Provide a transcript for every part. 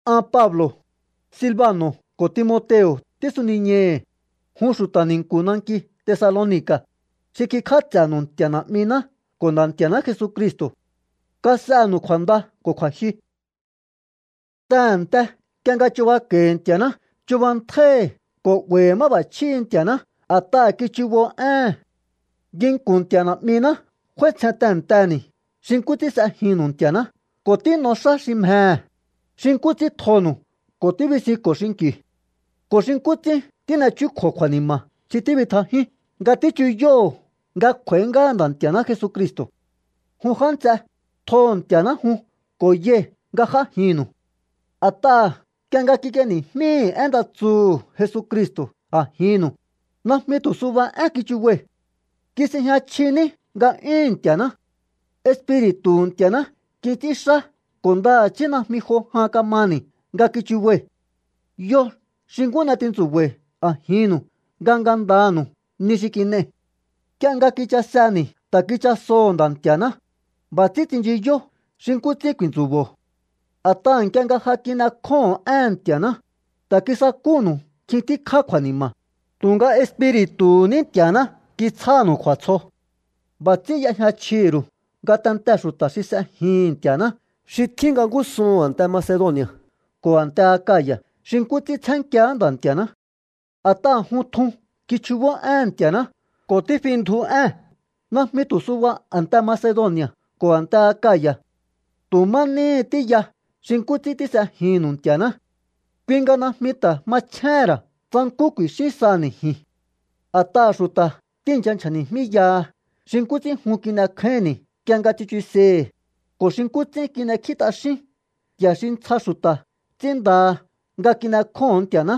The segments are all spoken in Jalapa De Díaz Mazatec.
An Pablo̱, Silbano̱ ko̱ Timoteo̱ tísuniñai̱hi̱, jun xu̱ta̱ ni̱nku̱ nanki Tesaloni̱ka̱, xi kikj'áts'e̱nu̱u Nti̱a̱ Na̱'miná ko̱ Nda̱ Nti̱a̱ná Jesucristo̱. Kas'enu̱u kju̱a̱nda ko̱ kju̱a̱jyu. Tehe̱nte nk'ie nga chubako̱i̱ Nti̱a̱ná chubantjái̱hi̱ ko̱ 'ba̱i̱hi̱ máb'a̱chjíhi̱ Nti̱a̱ná a̱t'aha̱ kichubó éhe̱n. Nginku̱n Nti̱a̱ Na̱'miná f'áítsjen tehe̱nteni̱ xi nkú ts'ín s'ejinnu̱u Nti̱a̱ná ko̱ tín'o xá xi mjehe̱, xi nkú ts'ín tjonu̱u ko̱ tíbisinko̱o xinki̱u, ko̱ xi nkú ts'ín tín'echjúkjo̱o kju̱a̱ni̱ma̱ xi tíbitjajíún nga tíchuyóho̱o nga kj'u̱a̱í ngáha Nda̱ Nti̱a̱ná Jesucristo̱. Jun já nts'e, tjoho̱ Nti̱a̱ná jun ko̱ yai̱ nga j'ájinnu̱u. A̱t'aha̱ nk'ie nga kik'ieni̱jmíi̱ én nda tsuhu̱ Jesucristo̱ a̱jinnu̱u, najmi tu̱ suba én kichubai̱. Kis'ejña chji ní nga'yúhu̱n Nti̱a̱ná. Espiri̱tu̱hu̱ Nti̱a̱ná kits'ínxá ko̱ ndaha̱chí najmi jo jan kamani̱ nga kichubai̱. Yo xi nkú n'e tintsu̱ba̱i̱ a̱jinnu̱u nga ngandanu̱u ni xi kin'ei̱. Nk'ie nga kichaseni̱ ta̱ kichasoo̱hó Nda̱ Nti̱a̱ná, b'a̱ ts'ín tsinchiyó xi nkú ts'ín ku̱i̱ntsu̱bo̱o. A̱t'aha̱ nk'ie nga ja kin'ekjóho̱on éhe̱n Nti̱a̱ná, ta̱ kisakúnu̱u nkjin tíkjá kju̱a̱ni̱ma̱, tu̱nga Espiri̱tu̱hu̱ ní Nti̱a̱ná kitsjánu̱u kju̱a̱tsjo. B'a̱ ts'ín y'ejña chjihi̱ ru̱u ngatentee̱ xu̱ta̱ xi s'ejihi̱n Nti̱a̱ná xi tjín nga ngúsuhu̱n a̱nte Macedoni̱a̱ ko̱ a̱nte Akaya̱ xi nkú ts'ín tsjenkíaá Nda̱ Nti̱a̱ná. A̱t'aha̱ jun tjun kichjubó éhe̱n Nti̱a̱ná ko̱ tífindju ée̱n najmi tu̱ suba a̱nte Macedoni̱a̱ ko̱ a̱nte Akaya̱. Tu̱ má níhi tíya xi nkú ts'ín tís'ejinnu̱u Nti̱a̱ná. Kui nga najmi ta̱ machjéhe̱n ra̱ tsa nkú ku̱i̱xín saha̱ni̱ ji̱n. A̱t'aha̱ xu̱ta̱ tíi̱ncha nchja̱ni̱jmíyaha xi nkú ts'ín jun kin'ekjáínni̱ nk'ie nga tsichusei̱hi̱, ko̱ xi nkú ts'ín kin'ekjí t'axíún nti̱a̱ xi ntsja xu̱ta̱ ts'ínndaha nga kin'ekjóho̱on Nti̱a̱ná.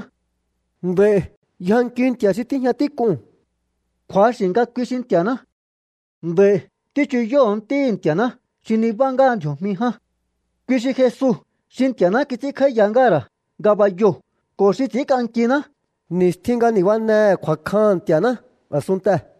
Nd'a̱i̱ yjankiu Nti̱a̱ xi tíjña tík'uu̱n. Kju̱axi̱ nga kui xi Nti̱a̱ná. Nd'a̱i̱ tíchuyóho̱o Ntíhi̱ Nti̱a̱ná xi nibá ngáha ndji̱o̱jmi ján. Kui xi Jesu xi Nti̱a̱ná kits'ínkj'áíya ngáha̱ ra̱ ngabayoo̱ ko̱ xi ts'i̱ínk'ankiná ni̱stjin nga nibánehe̱ kju̱a̱kjaha̱n Nti̱a̱ná a̱sunntee̱.